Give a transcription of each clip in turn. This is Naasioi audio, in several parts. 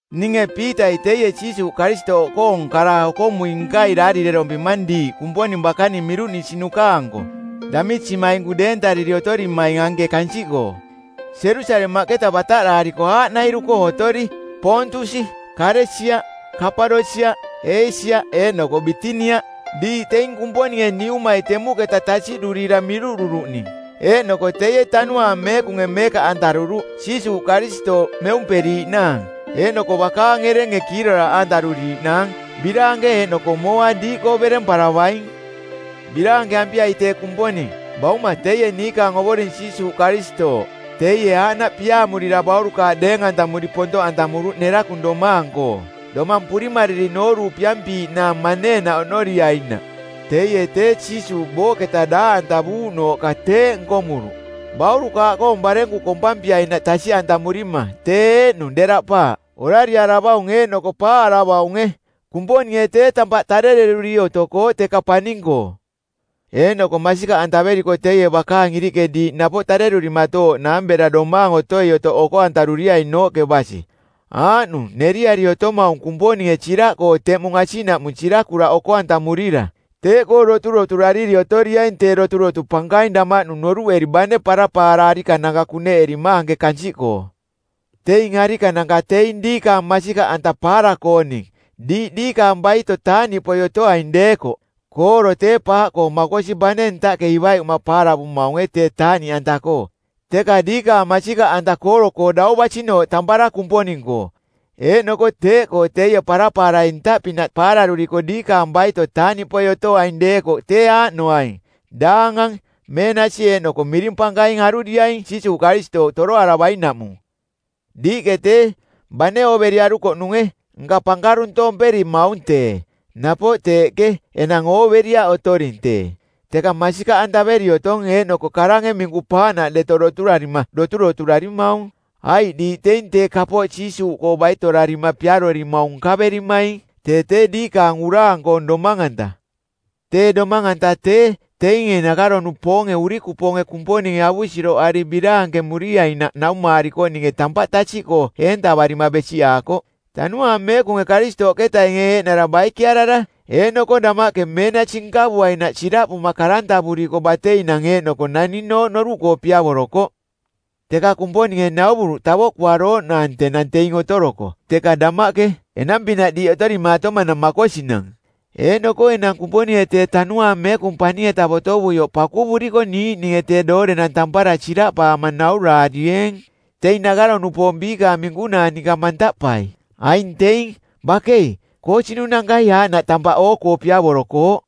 Ninge Piitai teie Jiisuuꞌ Karistooꞌkoong kara-okomui-nkai daarirerompimang diiꞌ Kumponing bakaning miruꞌnisinuka-anko, damisimainku deentariri otorimaing anke kansiꞌkoo, Jerusalemaꞌketa bataꞌdaariko aaꞌnairu-koo otori: Poontusi, Kalesia, Kapadosiaꞌ, Eesia eeꞌnoko Bitinia. Diiꞌ teing Kumponinge Niumai temuꞌketa tasiꞌdurira miruꞌruruꞌning, eeꞌnoko teie Tanuaang Meekunge meekaꞌantaruruꞌ, Jiisuuꞌ Karistooꞌ meumperiiꞌnaang, eeꞌnoko bakaang erenge kiiroraaꞌ antaruriiꞌnaang. Biraanke eeꞌnoko mooa diiꞌkoo beremparavaing. Biraankeampiai tee Kumponing, Bauma teie niikaang Ovoring Jiisuuꞌ Karistooꞌ. Teie aaꞌnaꞌ piaamurira baurukaaꞌ deeng-antamuri pontoꞌantamuruꞌ nerakung domaang-koo domang purimariri nooruupiampiiꞌnaang maneenaꞌ oꞌnoriainaꞌ. Teie tee, Jiisuuꞌ booꞌketa daaꞌantavuuꞌnooꞌka teeꞌ nkomuruꞌ, baurukaaꞌkoong barenku kompampiainaꞌ tasiꞌantamurima, tee eeꞌnung deraꞌpaaꞌ, orariaravaung eeꞌnoko paaꞌaravaunge. Kumponinge tee tampaꞌ tarereruri otokooꞌ teka paning-koo. Eeꞌnoko masikaꞌantaveriko teie bakaang iriꞌke diiꞌ napoꞌ tarerurimatooꞌnaang bera tee domaang otoi-otoꞌ oko-antaruriainooꞌke basi. Aaꞌnung neriari otomaung Kumponinge siraꞌkoo teꞌmung asiꞌnaꞌmung sirakuraꞌ oko-antamurira. Teeꞌkoo doturoturariri otoriaing tee doturotu pankaing damaꞌnung noruꞌeri bane parapaara arikananka kuneꞌerima anke kansiꞌkoo. Teing arikananka teing diikaang masikaꞌanta paara-kooning, diiꞌ diikaang baito taaꞌniꞌpoi otoaing deekoꞌ. Kooro tee paaꞌkoo makosi bane ntaꞌke ivaiꞌuma paara-antavaamaunge tee taaꞌniꞌanta-koo, teka diikaang masikaꞌanta kooro-koo dau basinooꞌ tampara Kumponing-koo, eeꞌnoko teeꞌkoo teie parapaarai ntaꞌpinaꞌ paararuriko diikaang baito taaꞌniꞌpoi otoaing deekoꞌ tee aaꞌnoaing: daangang, meenasi eeꞌnoko miring pankaing aruriaing Jiisuuꞌ Karistooꞌ toroaravainaꞌmung. Diiꞌke tee, bane ooveriarukoꞌnunge, nka pankaruntomperimaung tee. Napoꞌ teeꞌke enang ooveriaꞌ otoring tee, teka masikaꞌantaveri otong eeꞌnoko karange minku-paaꞌnaꞌ deto doturarima doturoturarimaung. Aiꞌ diiꞌ teing tee kapooꞌ Jiisuuꞌkoo baitorarima piarorimaung nkaverimaing, tee tee diikaang uraang˜koong domang-anta. Tee domang-anta tee, teinge nakaro-nupoonge˜ urikupoonge Kumponinge avusiroꞌari biraankemuriainaꞌ naumaarikoꞌninge tampaꞌ tasiꞌkoo eentavarima besiꞌaakoꞌ. Tanuaang Meekunge Karistooꞌketainge eeꞌnara baikearara eeꞌnoko damaꞌke meenasi nkavuainaꞌ siraꞌpuma karantavuriko˜ bateinang eeꞌnoko naninooꞌ noruꞌkoo piavorokoꞌ. Teka Kumponinge nauvuruꞌ tavoꞌkuarooꞌnaang tenang teing otoroko, teka damaꞌke, enang-pinaꞌ diiꞌ otorimaatomanang makosinang. Eeꞌnoko enang Kumponinge tee Tanuaang Meekung paning-eta botovuioꞌ pakuvuriko niiꞌninge tee doorenang tampara siraꞌpaama nauraarieeng, teing nakaro-nupoong biikaang minkunaa ninka mantaꞌpai. Aing teing, bakei, koosinunankai aaꞌnaꞌ tampaꞌ oo-koo piavorokooꞌ.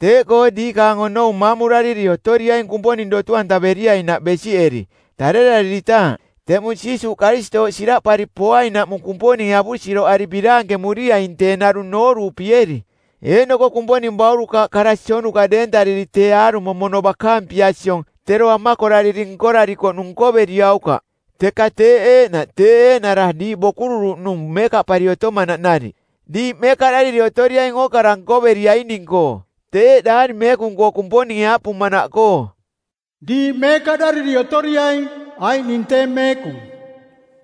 Teeꞌkoo diikaang onou maamurariri otoriaing Kumponing dotu-antaveriainaꞌ besiꞌeri, tarerariritaaꞌ, teꞌmung Jiisuuꞌ Karistooꞌ siraꞌpari poainaꞌmung Kumponinge avusiroꞌari biraankemuriaing tee narung nooruupieri. Eeꞌnoko Kumponing baurukaaꞌ kara sionuka deentariri tee aarumo mono bakaang pia siong tero amakorariri nkorarikoꞌnung nkoveriaukaꞌ. Teka teeꞌ eeꞌnaꞌ tee eeꞌnara diiꞌ bokururuꞌnung meekaꞌpari otomanaꞌ nariꞌ diiꞌ meekaꞌdariri otoriaing ookara nkoveriaining-koo. Teeꞌ Daari Meekung-koo Kumponinge aaꞌpumanaꞌkoo, “Diiꞌ meekaꞌdariri otoriaing, aiꞌ ning tee meekung.”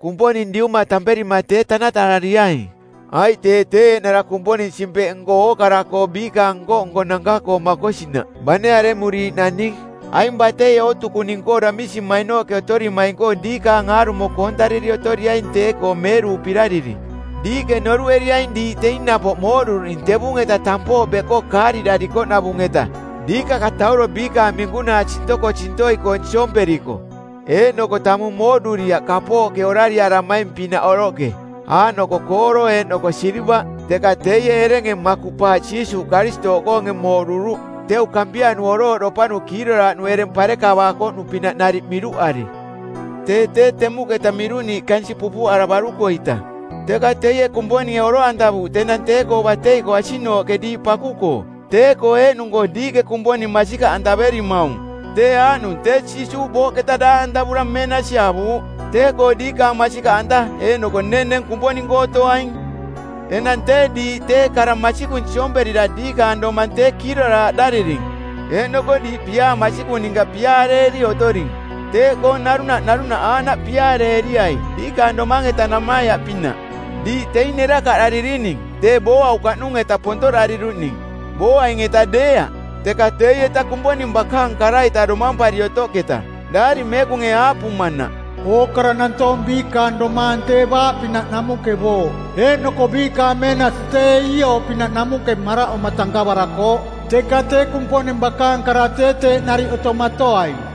Kumponing Diuma tamperima tee tanatarariaing, aiꞌ tee tee eeꞌnara Kumponing Simpeꞌnko˜ ookara-koo biikaang nko-nkonanka-koo makosinaꞌ, bane aremuriiꞌ naning. Aing batei-koo ootukuning-koo damisimainooꞌke otorimaing-koo diikaang aarumo koontariri otoriaing tee-koo meerupirariri. Diiꞌke noruꞌeriaing diiꞌ teing napoꞌ mooꞌduruꞌning tevung-eta tampooꞌ beꞌkoo kaariꞌdarikoꞌnavung-eta diikakatauro biikaang minkunaa sintokosintoi-koong siomperiko, eeꞌnoko tamung mooꞌduriaꞌ kapooꞌke orariaramaing-pinaꞌ oroꞌke, aaꞌnoko kooro eeꞌnoko silivaꞌ. Teka teie erenge makuꞌpaaꞌ Jiisuuꞌ Karistooꞌkoonge mooꞌduruꞌ teu kampianu orooꞌdopanu kiiroraaꞌnu ereng parekavaakoꞌnu-pinaꞌ nariꞌ miruꞌari. Tee tee temuꞌketa miruꞌniiꞌ kansiꞌ pupuꞌaravaruko-ita, teka teie Kumponinge oroꞌantavuuꞌ tenang tee-koo batei-koo asiꞌnooꞌke diiꞌ paku-koo. Tee-koo eeꞌnung-koo diiꞌke Kumponing masikaꞌantaverimaung, tee aaꞌnung tee Jiisuuꞌ booꞌketa daaꞌantavura meenasi avuuꞌ. Teeꞌkoo diikaang masikaꞌanta eeꞌnoko nenneng Kumponing-koo otoaing. Enang tee diiꞌ tee kara masikung siomperira diikaang domang tee kiiroraaꞌdariring eeꞌnoko diiꞌ piaa masikung ninka piaareeri otoring. Teeꞌkoo narunaꞌ narunaꞌ aaꞌnaꞌ piaareeriai diikaang domang-eta namaiaꞌpinaꞌ. Diiꞌ teing nerakaꞌdaririning, tee booaukaꞌnung-eta pontoꞌdariruꞌning, booaing-eta deeaꞌ, teka teieta Kumponing bakaang kara-ita domampari otoꞌketa. Daari Meekunge aaꞌpumanaꞌ, “Ookara nantoong biikaang domaang tee baaꞌ pinaꞌ namuꞌke booꞌ, eeꞌnoko biikaang meenasi tee iiooꞌ pinaꞌ namuꞌke maraꞌoma tankavarakooꞌ, teka tee Kumponing bakaang kara tee teeꞌ nariꞌ otomatoaing.”